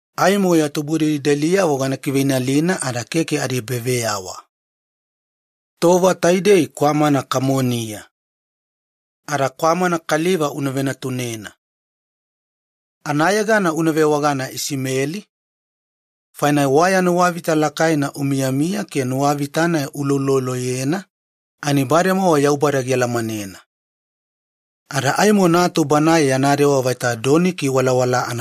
Aimo ya tubudelideliyavo gana kiveinalina ada keke adiebaveyawa. Tova taidei kwamana kamoniya, ada una venatunena kwamana kaliva. Anayegana una vewagana Isimeli, faina waya nuwavita lakaina umiyamiya ke nuwavita-nai uulouloloyena ani bademowa Yaubada gialamanena. Ada aimo natu banae yana dewa anafaiweya doniki walawalaa.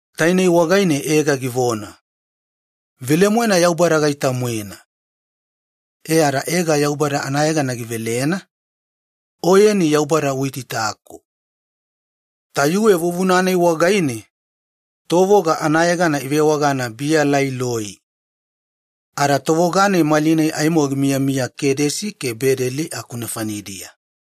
Tainei wagaine Ega givona, “Velemoena Yaubada gaita-moena.” E ada Ega Yaubada anayegana ivelena, ‘Oyeni Yaubada Uitaitaku’. Tayuwe vuvuna-nai wagaine tovoga anayegana ivewagana ‘Biya Laai Loi’. Ada tovoga-nai malinai aimo gimiyamiya Kedesi ke Beledi aku nefanidiya.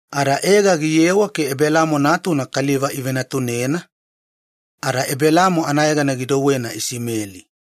Ada Ega giyewa ke Ebelamo natuna kaliva ivenatunena ada Ebelamo anayegana gidouwena Isimeli.